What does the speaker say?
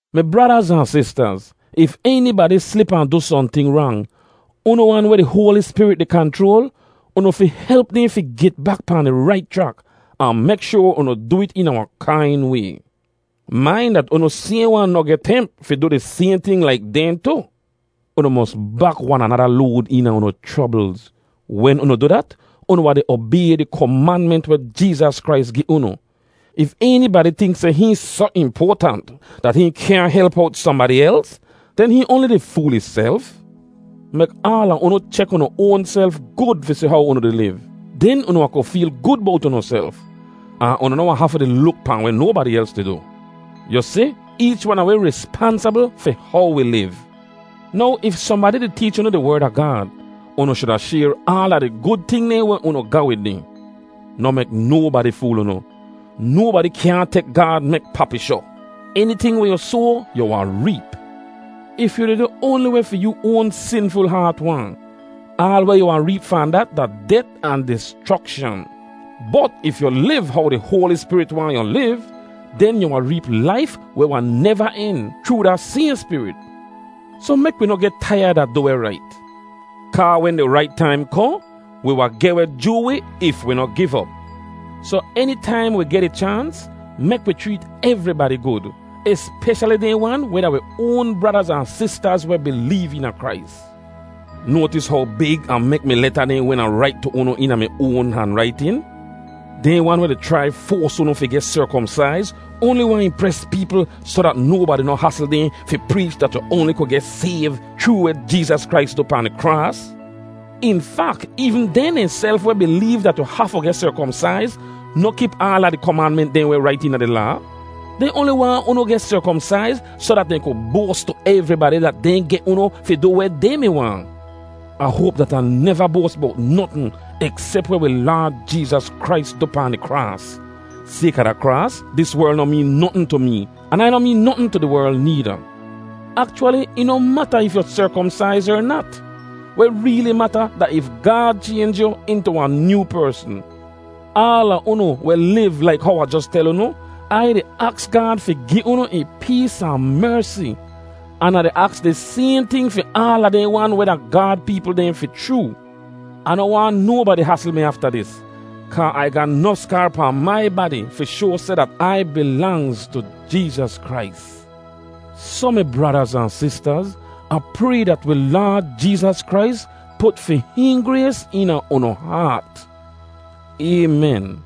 Mi bradaz ahn sistaz, if enibadi slip ahn du sohnting rang, unu wan weh di Hoali Spirit di kanchroal, unu fi help dehn fi get bak pahn di rait chrak; ahn mek shoar unu du it eena wahn kain way. Main dat unu sayhn wan noh geh temp fi du di sayhn ting laik dehn tu. Unu mos bak wan anada load eena unu chroblz. Wen unu du dat, unu wahn di obay di komanment weh Jeezas Krais gi unu. If enibadi tink seh hihn soh impoatant dat hihn kyaahn help owt sohnbadi els, den hihn oanli di fool ihself. Mek aala unu chek unu oanself gud fi si how unu di liv. Den unu wahn ku feel gud bowt unuself, ahn unu noh wahn hafu di luk pahn weh nobadi els di du. Yu si, eech wan a wi rispansabl fi how wi liv. Now if sohnbadi di teech unu di Werd a Gaad, unu shuda shayr aala di gud ting dehn weh unu ga wid dehn. Noh mek nobadi fool unu: nobadi kyaahn tek Gaad mek papishoh. Eniting weh yu soa, yu wahn reep. If yu di du oanli weh fi yoo oan sinful haat waahn, aal weh yu wahn reep fahn dat da det ahn dischrokshan. Bot if yu liv how di Hoali Spirit waahn yu liv, den yu wahn reep laif weh wahn neva en chroo da sayhn Spirit. Soh mek wi noh geh taiyad a du weh rait, kaa wen di rait taim kohn, wi wahn geh weh joo wi if wi noh giv op. Soh enitaim wi geh di chaans, mek wi chreet evribadi gud, espeshali dehn wan weh da wi oan bradaz ahn sistaz weh bileev eena Krais. Noatis how big Ah mek mi leta dehn wen Ah rait tu unu eena mi oan hanraitin? Dehn wan weh di chrai foas unu fi geh serkomsaiz oanli waahn impres peepl soh dat nobadi noh hasl dehn fi preech dat yu oanli ku geh sayv chroo weh Jeezas Krais du pahn di kraas. In fak, eevn dehn dehnself weh bileev dat yu hafu geh serkomsaiz noh kip aala di komanment dehn weh rait eena di Laa. Dehn oanli waahn unu geh serkomsaiz soh dat dehn ku boas tu evribadi dat dehn geh unu fi du weh dehn mi waahn. Ah hoap dat Ah neva boas bowt notn eksep weh wi Laad Jeezas Krais du pahn di kraas. Sayka da kraas, dis werl noh meen notn tu mee, an Ai noh meen notn tu di werl needa. Akchwali, ih noh mata if yu serkomsaiz er nat. Weh reeli mata da if Gaad chaynj yu intu wahn nyoo persn. Aala unu weh liv laik how Ah jos tel unu, Ai di aks Gaad fi gi unu ih pees ahn mersi, an Ah di aks di sayhn ting fi aala dehn wan weh da Gaad peepl dehn fi chroo. Ah noh waahn nobadi hasl mi afta dis kaa Ai ga nof skaar pahn mai badi fi shoa seh dat Ai bilangz tu Jeezas Krais. Soh mi bradaz ahn sistaz, Ah pray dat wi Laad Jeezas Krais put fi hihn grays eena unu haat. Aymen.